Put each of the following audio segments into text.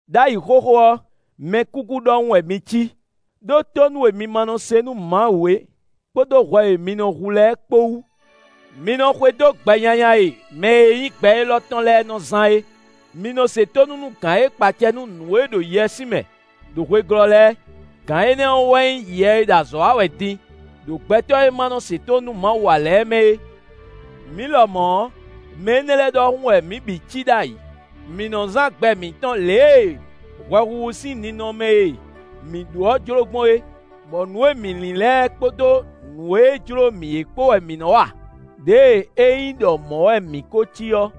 Đ'ayǐ xóxó ɔ́, mɛkúkú ɖɔhun wɛ mi cí, ɖó tónú e mi ma nɔ se nú Mawu é, kpódó hwɛ e mi nɔ hu lɛ́ɛ kpó wú. Mi nɔ xwedó gbɛ nyanya e mɛ e nyí gbɛ élɔ́ tɔn lɛ́ɛ nɔ zán é. Mi nɔ se tónú nú gǎn e kpa acɛ nú nǔ e ɖo yɛswímɛ ɖo hwe glɔ́ lɛ́ɛ. Gǎn énɛ́ ɔ́ wɛ nyí yɛ e ɖo azɔ̌ wa wɛ din ɖo gbɛtɔ́ e ma nɔ se tónú nú Mawu ǎ lɛ́ɛ mɛ é. Mǐ lɔmɔ̌ ɔ́, mɛ énɛ́ lɛ́ɛ ɖɔhun wɛ mǐ bǐ cí ɖ'ayǐ; mǐ nɔ zán gbɛ mǐtɔn lě e hwɛhuhu sín ninɔmɛ e mǐ ɖó ɔ́ jló gbɔn é, bɔ nǔ e mǐ lin lɛ́ɛ kpódó nǔ e jló mǐ é kpó wɛ mǐ nɔ́ wa. Đěe é nyí ɖɔ mɔ̌ wɛ mǐ kó cí ɔ́,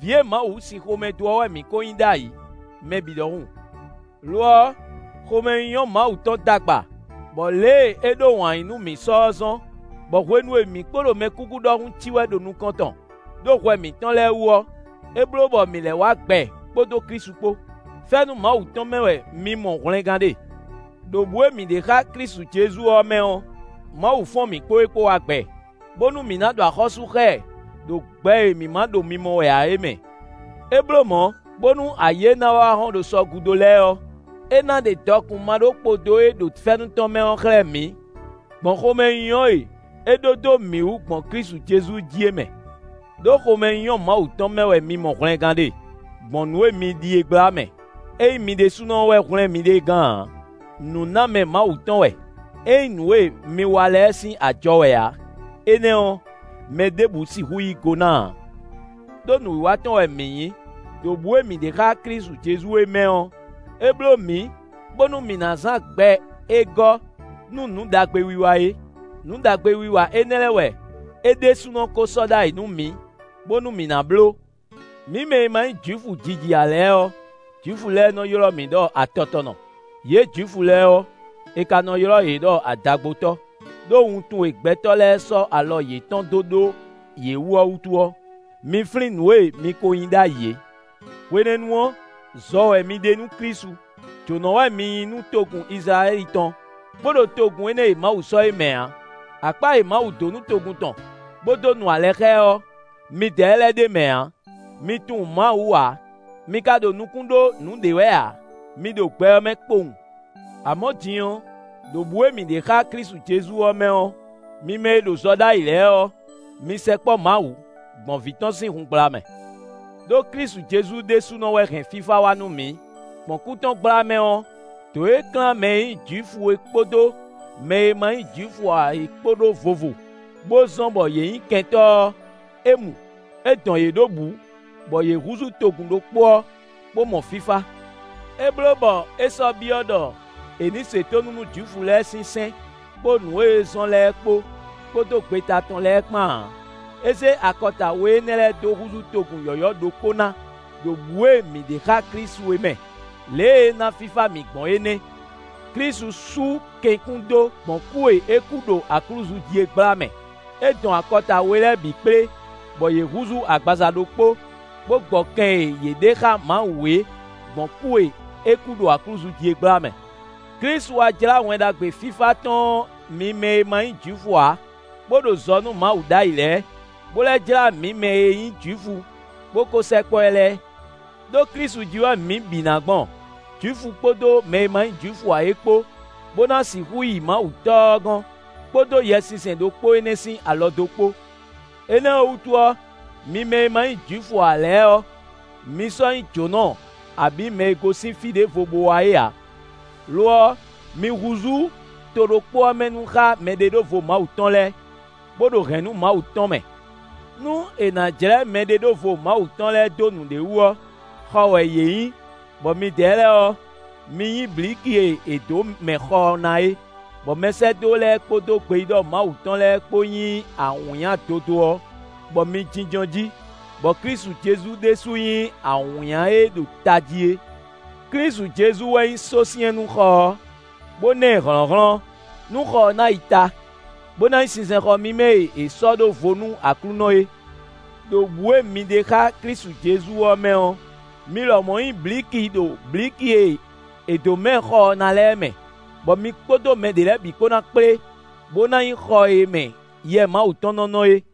vǐ e Mawu sín xomɛ dó ɔ́ wɛ mǐ kó nyí ɖ'ayǐ, mɛ bǐ ɖɔhun. Lo ɔ́, xomɛnyínyɔ́ Mawu tɔn d'agba, bɔ lě e é ɖó wǎn yíyí nú mǐ sɔ́ é zɔ́n, bɔ hwenu e mǐ kpo ɖo mɛkúkú ɖɔhun cí wɛ ɖo nukɔn tɔn, ɖó hwɛ mǐtɔn lɛ́ɛ wú ɔ́, é bló bɔ mǐ lɛ́ wá gbɛ kpódó Klísu kpó. Fɛ́nú Mawu tɔn mɛ wɛ mi mɔ hwlɛngán ɖe. Đo bǔ e mǐ ɖe xá Klísu Jezu ɔ́ mɛ ɔ́, Mawu fɔ́n mǐ kpó e kpó wá gbɛ, bónú mǐ ná ɖu axɔ́sú xá ɛ ɖo gbɛ e mǐ ma ɖo mimɔ wɛ ǎ é mɛ. É bló mɔ̌, bónú ayǐ e ná wá hɔ́n ɖo sɔ gúdo lɛ́ɛ ɔ́, é ná ɖe dɔkun maɖókpodó e ɖo fɛ́nú tɔn mɛ ɔ́ xlɛ́ mǐ, gbɔn xomɛnyínyɔ́ e é ɖó dó mǐ wú gbɔn Klísu Jezu jí é mɛ. Đó xomɛnyínyɔ́ Mawu tɔn mɛ wɛ mi mɔ hwlɛngán ɖe, gbɔn nǔ e mi ɖi é gbla mɛ. É nyí mi ɖésúnɔ wɛ hwlɛ́n miɖée gán ǎ; nǔnámɛ Mawu tɔn wɛ. É nyí nǔ e mi wa lɛ́ɛ sín ajɔ wɛ ǎ; énɛ́ ɔ́, mɛ ɖěbǔ sixú yí go ná ǎ. Đó nǔwiwa tɔn wɛ mǐ nyí; ɖo bǔ e mǐ ɖe xá Klísu Jezu é mɛ ɔ́, é bló mǐ, bónú mǐ ná zán gbɛ e gɔ́ nú nǔ ɖagbe wiwa é. Nǔ ɖagbe wiwa énɛ́ lɛ́ɛ wɛ é ɖésúnɔ kó sɔ́ ɖ'ayǐ nú mǐ, bónú mǐ ná bló. Mi mɛ e ma nyí Jwifu jiji ǎ lɛ́ɛ ɔ́, Jwifu lɛ́ɛ nɔ́ ylɔ́ mi ɖɔ atɔtɔnɔ; yě Jwifu lɛ́ɛ ɔ́, è ka nɔ ylɔ́ yě ɖɔ adagbotɔ́, ɖó wuntun e gbɛtɔ́ lɛ́ɛ sɔ́ alɔ yětɔn dó ɖó yě wú ɔ́ wútu ɔ́, mi flín nǔ e mi ko nyí ɖ'ayǐ é. Hwenɛ́nu ɔ́, zɔ wɛ mi ɖe nú Klísu; jǒnɔ wɛ mi nyí nú togun Izlayɛ́li tɔn, bó ɖo togun énɛ́ e Mawu sɔ́ é mɛ ǎ. Akpá e Mawu dó nú togun tɔn, bó dó nu alɛ xá ɛ ɔ́, midɛɛ lɛ́ɛ ɖ'é mɛ ǎ. Mi tunwun Mawu ǎ; mi ka ɖo nukún ɖó nǔɖé wɛ ǎ; mi ɖo gbɛ ɔ́ mɛ kpowun. Amɔ̌ din ɔ́, ɖo bǔ e mǐ ɖe xá Klísu Jezu ɔ́ mɛ ɔ́, mi mɛ e ɖo zɔ ɖ'ayǐ lɛ́ɛ ɔ́, mi sɛkpɔ́ Mawu, gbɔn Vǐ tɔn sín hun gbla mɛ. Đó Klísu Jezu ɖésúnɔ wɛ hɛn fífá wá nú mǐ; gbɔn kú tɔn gbla mɛ ɔ́, dǒ e klán mɛ e nyí Jwifu é kpódó mɛ e ma nyí Jwifu ǎ é kpó ɖó vovo, bó zɔ́n bɔ yě nyí kɛntɔ́ ɔ́, é mu. É dɔn yě ɖó bǔ, bɔ yě húzú togun ɖokpó ɔ́, bó mɔ fífá. É bló bɔ é sɔ́ byɔ́ ɖɔ è ní se tónú nú Jwifu lɛ́ɛ sín sɛ́n, kpó nǔ é nɔ zɔ́n lɛ́ɛ kpó, kpódó gbeta tɔn lɛ́ɛ kpán ǎ. É zé akɔta we énɛ́ lɛ́ɛ dó húzú togun yɔ̌yɔ́ ɖokpó ná ɖo bǔ e mǐ ɖe xá Klísu é mɛ. Lě e é ná fífá mǐ gbɔn é nɛ́. Klísu sú kɛn kún dó, gbɔn kú e é kú ɖo aklúzu jí é gbla mɛ; é dɔn akɔta we lɛ́ɛ bǐ kplé, bɔ yě húzú agbaza ɖokpó, bó gbɔ kɛn e yě ɖe xá Mawu é, gbɔn kú e é kú ɖo aklúzu jí é gbla mɛ. Klísu wá jlá Wɛn Ɖagbe fífá tɔn ɔ́ mi mɛ e ma nyí Jwifu ǎ, bó ɖo zɔ nú Mawu ɖ'ayǐ lɛ́ɛ, bó lɛ́ jlá mǐ mɛ e nyí Jwifu, bó kó sɛkpɔ́ ɛ lɛ́ɛ. Đó Klísu jí wɛ mǐ bǐ ná gbɔn, Jwifu kpódó mɛ e ma nyí Jwifu ǎ é kpó, bó ná sixú yi Mawu Tɔ́ ɔ́ gɔ́n, kpódó Yɛsinsɛn ɖokpó énɛ́ sín alɔdó kpó. Énɛ́ ɔ́ wútu ɔ́, mi mɛ e ma nyí Jwifu ǎ lɛ́ɛ ɔ́, mi sɔ́ nyí jǒnɔ abǐ mɛ e gosín fí ɖěvo bó wá é ǎ; lo ɔ́, mi húzú to ɖokpó ɔ́ mɛ nu xá mɛɖeɖóvo Mawu tɔn lɛ́ɛ, bó ɖo hɛ̌nnu Mawu tɔn mɛ. Nú è nǎ jlɛ́ mɛɖeɖóvo Mawu tɔn lɛ́ɛ dó nǔɖé wú ɔ́, xɔ wɛ yě nyí, bɔ midɛɛ lɛ́ɛ ɔ́, mi nyí blǐki e è dǒ mɛ xɔ ɔ́ ná é, bɔ mɛsɛ́dó lɛ́ɛ kpódó gbeyíɖɔ Mawu tɔn lɛ́ɛ kpó nyí awǐnnya dodó ɔ́, bɔ mi jínjɔ́n jí; bɔ Klísu Jezu ɖésú nyí awǐnnya e ɖo tají é. Klísu Jezu wɛ nyí sósyɛ́n nú xɔ ɔ́, bó ná ɛ hlɔ̌nhlɔ́n, nú xɔ ɔ́ ná yi ta, bó ná nyí sinsɛnxɔ mímɛ́ e è sɔ́ ɖó vo nú Aklúnɔ é. Đo bǔ e mi ɖe xá Klísu Jezu ɔ́ mɛ ɔ́, mi lɔmɔ̌ nyí blǐki ɖo blǐki e è dǒ mɛ xɔ ɔ́ ná lɛ́ɛ mɛ; bɔ mi kpódó mɛ ɖě lɛ́ɛ bǐ kpó ná kplé bó ná nyí xɔ e mɛ Yɛ Mawu tɔn nɔ́ nɔ é.